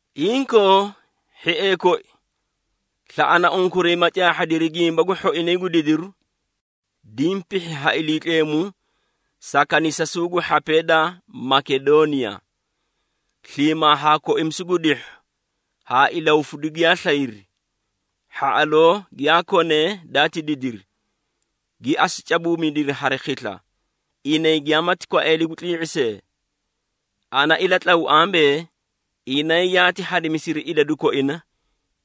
Inkoo, hhiee koi, slaꞌana unkuray ma caahhadiri gimba gu hhoinay gu didiru, diĩ pihhi ha Iliitleemu sa kanisasuu gu hhapee da Makedooniya. Sliimaa haa koimisu gu dihhu haa ilahufidu giyaa slayri, hhaꞌaloo giyaa konee daati didiri, gi asu cabuumidiri hari khisla, inay giyamaati kwaeeli gu tlii⁄i see. Ana ilatlaw ambee, inay yaati hadimisiri idadu koina,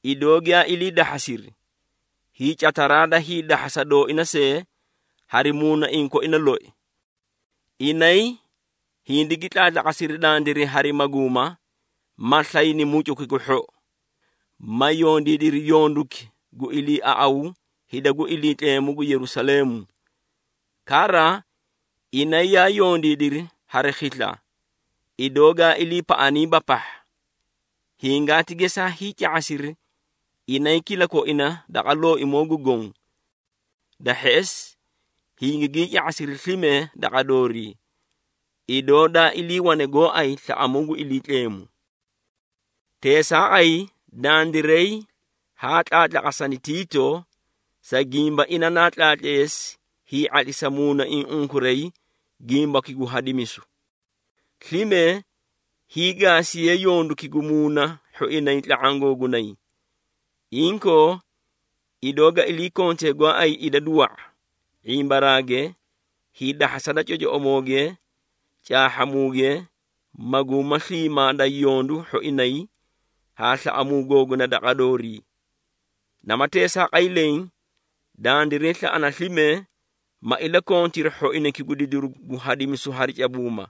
idoo giyaa ilii dahhasiri, hiicataraa da hiidahhasa dooina see, hari muunaiĩ koina loi. Inay hindigi tlaatlaqasiri dandiray hari maguuma, ma slayri mucuki gu hhou, ma yondiidiri yonduki gu iliiaꞌaw hida gu Iliitleemu gu Yerusaleemu. Kara, inay yaa yondiidiri hari khisla idoo gaa iliipaꞌaniiba pahha. Hingaati gesaa hiica⁄asiri inay kilakoina daqa Looimoo gu Goõ. Da hheꞌesi, hingigii ca⁄asiri slime daqa doorii, idoo da iliiwane gooay slaꞌamuu gu Iliitleemu. Teesaaqay, dandiray haa tlaatlaqasani Tiito, sa gimba ina naa tlaatleesi hii⁄atlisa muunaiĩ unkuray gimbaki gu hadimisu. Slime hiigaasiye yonduki gu muuna hhoinay tla⁄aã googunay. Inkoo, idoo ga ilii kontee gooay idadu wa⁄a, ⁄imbaraage, hiidahhasa da cocoꞌomooge, caahhamuuge, maguuma sliimaa da yondu hhoinay, haa slaꞌamuu googuna daqa doorii. Nama teesaaqay leẽ, dandiray slaꞌana slime, ma ilakontiri hhoinayki gu didiru gu hadimisu hari cabuuma.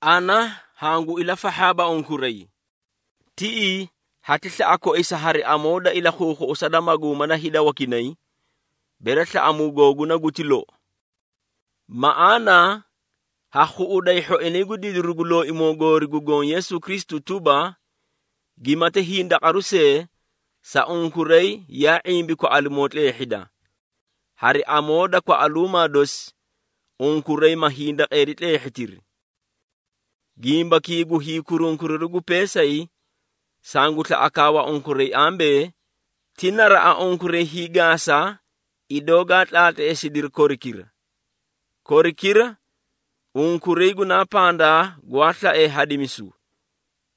Ana hangu ilafahhaaba unkuray. Tiꞌii hati slaꞌa koisa hari amoo da ilakhuukhuꞌusa da maguuma da hida wakinay, bere slaꞌamuu googuna guti lou. Maꞌaana ha khuꞌuday hhoinay gu didiru gu Looimoo goori gu Goõ Yeesu Kristu tuba, gimati hindaqaru see sa unkuray yaa ⁄imbi kwaꞌalimoo tleehhida. Hari amoo da kwaꞌaluumaa dosi, unkuray ma hindaqeeri tleehhitiri. Gimbakii gu hiikurunkuriru gu peesay, sangu slaꞌa kaawa unkuray ambee, ti naraꞌa unkuray hiigaasa idoo gaa tlaatleesidiri korikira. Korikira unkuray gunaa pandaa gwaa slaee hadimisu,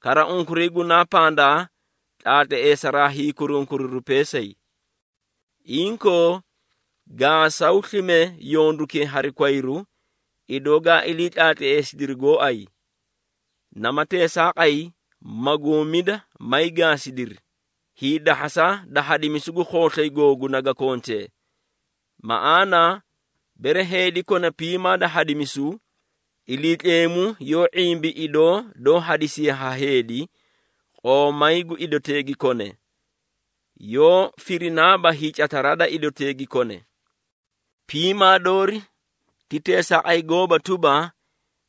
kara unkuray gunaa pandaa tlaatleesaraa hiikurunkuriru peesay. Inkoo, gaasaw slime yondukee hari kwayru, idoo gaa ilii tlaatleesidiri gooay. Nama teesaaqay, maguumida may gaasidiri, hiidahhasa da hadimisu gu khooslay googunay ga kontee. Maꞌaana, bere heedi kona piimaa da hadimisu, Iliitleemu yoó ⁄imbi idoo doó hadisiye ha heedi, qoomay gu idotee gi kone, yoó firinaaba hiicataraa da idotee gi kone. Piimaa doori ti teesaaqay gooba tuba,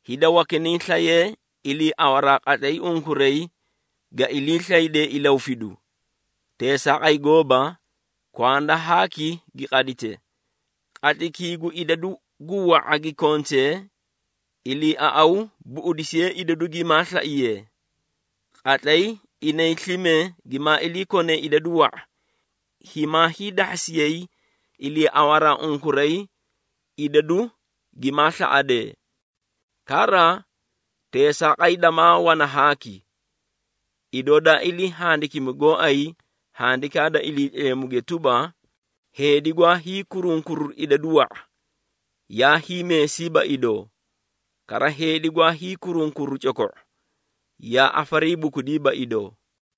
hida wakinay slayee iliiawaraa qatlay unkuray ga iliislaydee ilahufidu. Teesaaqay gooba, kwanda haaki gi qadite. Qatlaykii gu idadu gu wa⁄a gi konte, iliiaꞌawu buꞌudisiye idadu gimaa slaiyee. Qatlay inay slime gimaa ilii kone idadu wa⁄a, himaa hiidahhasiyay iliiawaraa unkuray idadu gimaa slaꞌadee. Kara, teesaaqay damaa wana haaki. Idoo daa ilii handikimi gooay Handikaa da Iliitleemuge tuba, “Heedi gwaa hiikurunkuru idadu wa⁄a, yaa hiimeesiiba idoo, kara heedi gwaa hiikurunkuru coko⁄o, yaa afariibukudiiba idoo.”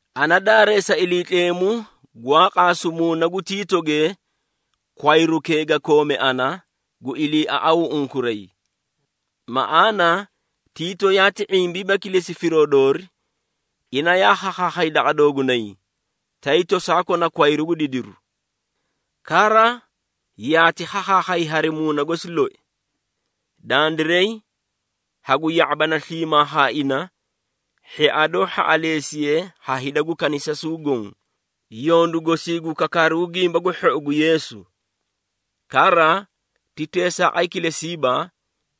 Ana daareesa Iliitleemu gwaa qaasu muuna gu Tiitoge kwayrukee ga koome ana, gu iliiaꞌawuu unkuray. Maꞌaana, Tiito yaati ⁄imbiiba kilesi firoo doori, ina yaa khakhaakhay daqa doogunay, tay tosaa kona kwayru gu didiru. Kara, yaati khakhaakhay hari muuna gosi loi. Dandiray hagu ya⁄abana sliimaa haa ina hhia doó hhaꞌaleesiye ha hida gu kanisasuu goõ, yondu gosii gu kakaaru gu Gimba gu Hhou gu Yeesu. Kara, ti teesaaqay kilesiiba,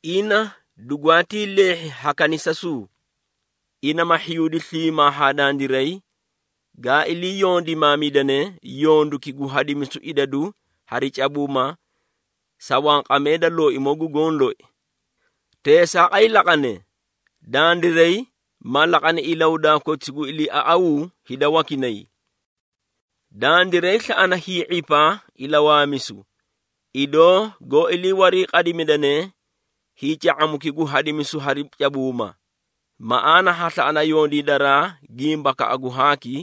ina dugwaatii leehhi ha kanisasuu. Ina ma hhiyuudi sliimaa haa dandiray, gaa ilii yondimaamidane yonduki gu hadimisu idadu hari cabuuma sa wanqamee da Looimoo gu Goõ loi. Teesaaqay laqane, dandiray ma laqani ilahudaa koti gu ilii iliiaꞌawuu hida wakinay. Dandiray slaꞌana hii⁄ipa ilawaamisu, idoo goó ilii wariiqadimidane hiica⁄amuki gu hadimisu hari cabuuma. Maꞌaana ha slaꞌana yondiidaraa gimbakaꞌa gu haaki,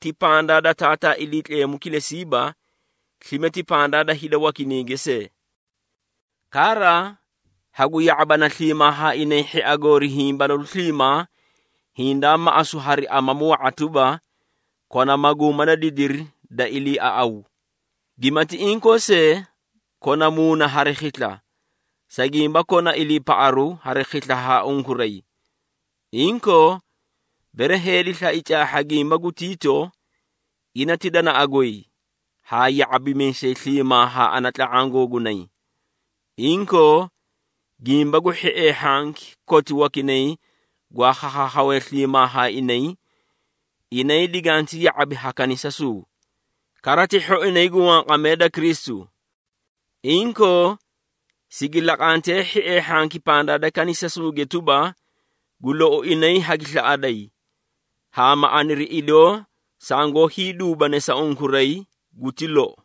ti pandaa da Taataa Iliitleemu kilesiiba, slime ti pandaa da hida wakinayge see. Kara, hagu ya⁄abana sliimaa haa inay hhia goori hiĩ balalu sliimaa hindaa maꞌasu hari amamu wa⁄a tuba, kona maguuma da didiri da iliiaꞌaw. Gimati inkoo see, kona muuna hari khisla, sa gimba kona iliipaꞌaru hari khisla haa unkuray. Inkoo, bere heedi slai caahha gimba gu Tiito, ina ti danaꞌa goy haa ya⁄abimiisay sliimaa haa ana tla⁄aã googunay. Inkoo, gimba gu hhiee hhanki koti wakinay gwaa khakhaakhawee sliimaa haa inay, inay diganti ya⁄abi ha kanisasuu, kara ti hhoinay gu wanqamee da Kristu. Inkoo, sigi laqantee hhiee hhanki pandaa da kanisasuuge tuba, gu lou inay hagi slaꞌaday, haa ma aniri idoo sangoó hiiduubane sa unkuray guti lou.